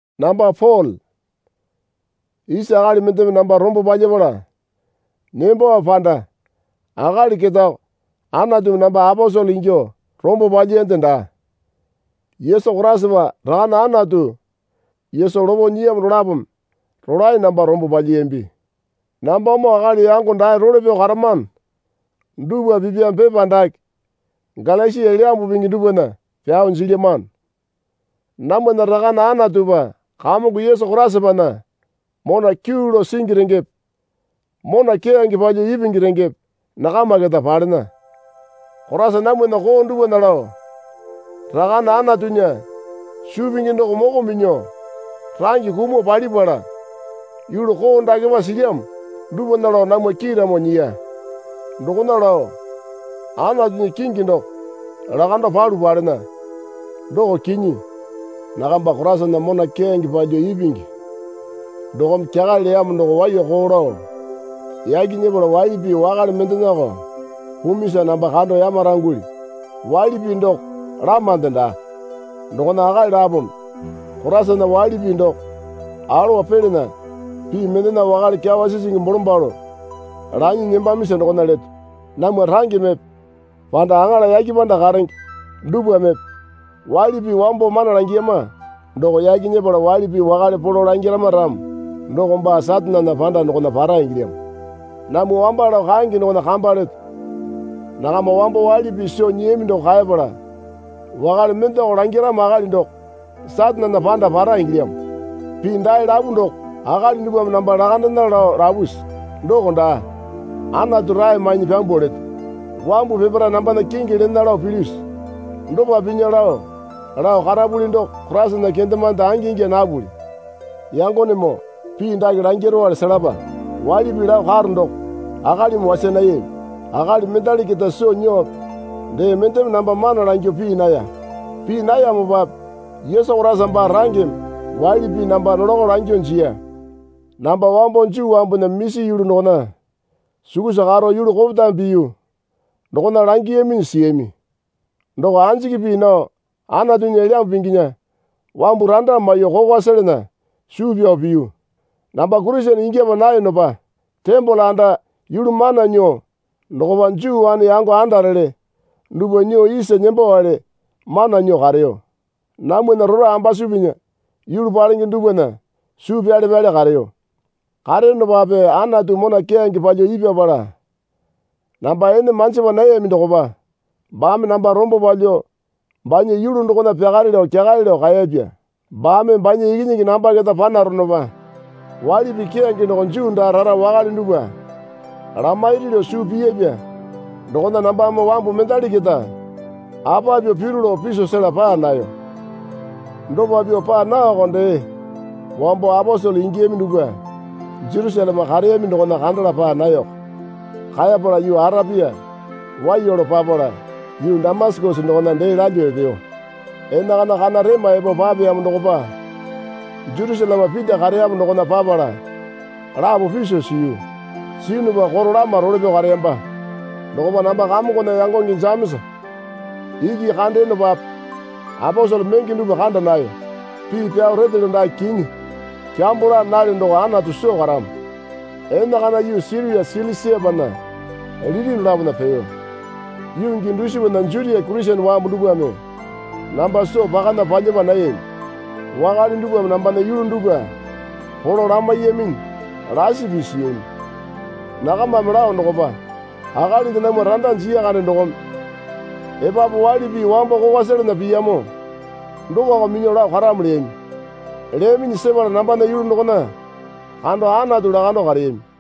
Namba Pole. Isa akali mendeme namba rombo palyapala nembowape panda akali ketako Anatumi namba aposele ingyuo rombo palyiyande daa. Yesu Koraisapa Rakane Anatu Yesu lopo nyiyamo dolapome rolae namba rombo palyiyambi. Nambamoo akali yango dae role pyao karamano dupwa pipyame pepa dake Galasia Elyambu Pingi dupwana pyao jilyamano. Namwana Rakane Anatupa Kamongo Yesu Koraisapana mona kyuu lao singi rengepe mona keyange palyuo ipingi rengepe nakama keta palena. Koraisa namwana koo dupwana lao Rakane Anatunya suu pingi doko moko minyuo range kumuo palipala yulu koo dakepa silyamo dupwana lao namwa kiiramo nyiya. Dokona lao Anatunya kingi doko lakando palu palena, doko kinyi. Nakamba Koraisana mona keyange palyuo ipingi dokome kyakale leyamo doo waiyako lao yaki nyepala waili pii wakale mendenako pumisa namba kando yamarangulyu. Waili pii doko lamande daa. Dokona akali lapome Koraisana waili pii doko alowa pelana pii mendena wakale kyawa sisingi bolombalo lanyi nembamisa dokona leto. Namwa rangemepe panda aŋala yake panda karenge dupwamepe waili pii wambo mana langiyama doko yaki nyepala waili pii wakale polo langirama ramo doko baa Satanena panda dokona para ingilyamo. Namwa wamba lao kaenge dokona kamba leto. Nakama wambo waili pii soo nyiyami doko kaepala wakale mendeko langiramo akali doko Satanena panda para ingilyamo. Pii dae lapu doko akali dupwame namba lakandena lao lapusi? Doko daa. Anatu rae mainyi pyambuo leto. Wambu peparae nambana kingi lena lao pilyusi? Dopa pinya lao lao karapuli doko Koraisana kendemande angi ingya napuli. Yangonemoo pii dake langirowale selapa. Waili pii lao karo doko akalimi wasa nayami. Akali mendali keta soo nyuope dee mendeme namba mana langyuo pii naya. Pii nayamopape Yesu Koraisa baa rangeme waili pii namba nolakao langyuo jiya. Namba wambo Juu wambunya misi yulu dokona sukusa karo yulu kopetame piyu dokona langiyaminyi siyami. Doko anjiki pii nao Anatunya Elyambu Pinginya wambu randa maiyuo kokwa selana suu pyao piyu. Namba Kurisene ingyapa nayonopa tembole anda yulu mana nyuo dokopa Juu wane yango andarele dupwa nyuo isa nembowale mana nyuo kareyo. Namwana rora ambasupinya yulu palenge dupwana suu pyale pyale kareyo. Kareyonopape Anatu mona keyange palyuo ipyapala namba ene manjipa nayami dokopa baame namba rombo palyuo banya yulu dokona pyakare lao kyakale lao kaeyapya. Baame banya Ikinyingi namba keta panaronopa waili pii keyange doko Juu daa rara wakale dupwa lamairi lao suu piyapya dokona nambame wambu mendali keta apa pyuo piru lao piso sela paa nayo. Dopa pyuo paa naoko dee wambo aposele ingiyami dupwa Jerusaleme kareyami dokona kandala paa nayoko. Kaepala yuu Arapia waiya lao papala yuu Damasakesa dokona dee lalyuo epeyo. Enakana kana rema epo papeyamo dokopa Jerusaleme Pita kareyamo dokona papala lapo piso siyu. Siyunupa koro lama role pyao kareyamba. Dokopa namba Kamongona yangonge Jemesa iki kandeyonopape aposele menge dupwa kanda nayo. Pii pyao retelyo dake kinyi. Kyambo laa nalyo doko Anatu soo karamo. Enakana yuu Siria Silisiapana liti dolapona peyo. Yuu gii dusipana Jutia Kurisene wambu dupwame namba soo pakana palyapa nayami. Wakale dupwame nambana yulu dupwa polo lamaiyaminyi lasi pii siyami. Nakamame lao dokopa, Akalinde namwa randa jiya kande dokome epapu waili pii wambo kokwa selana piyamo dokoko minyuo lao karamo leyami. Leyaminyi sepala nambana yulu dokona kando Anatu lakando kareyami.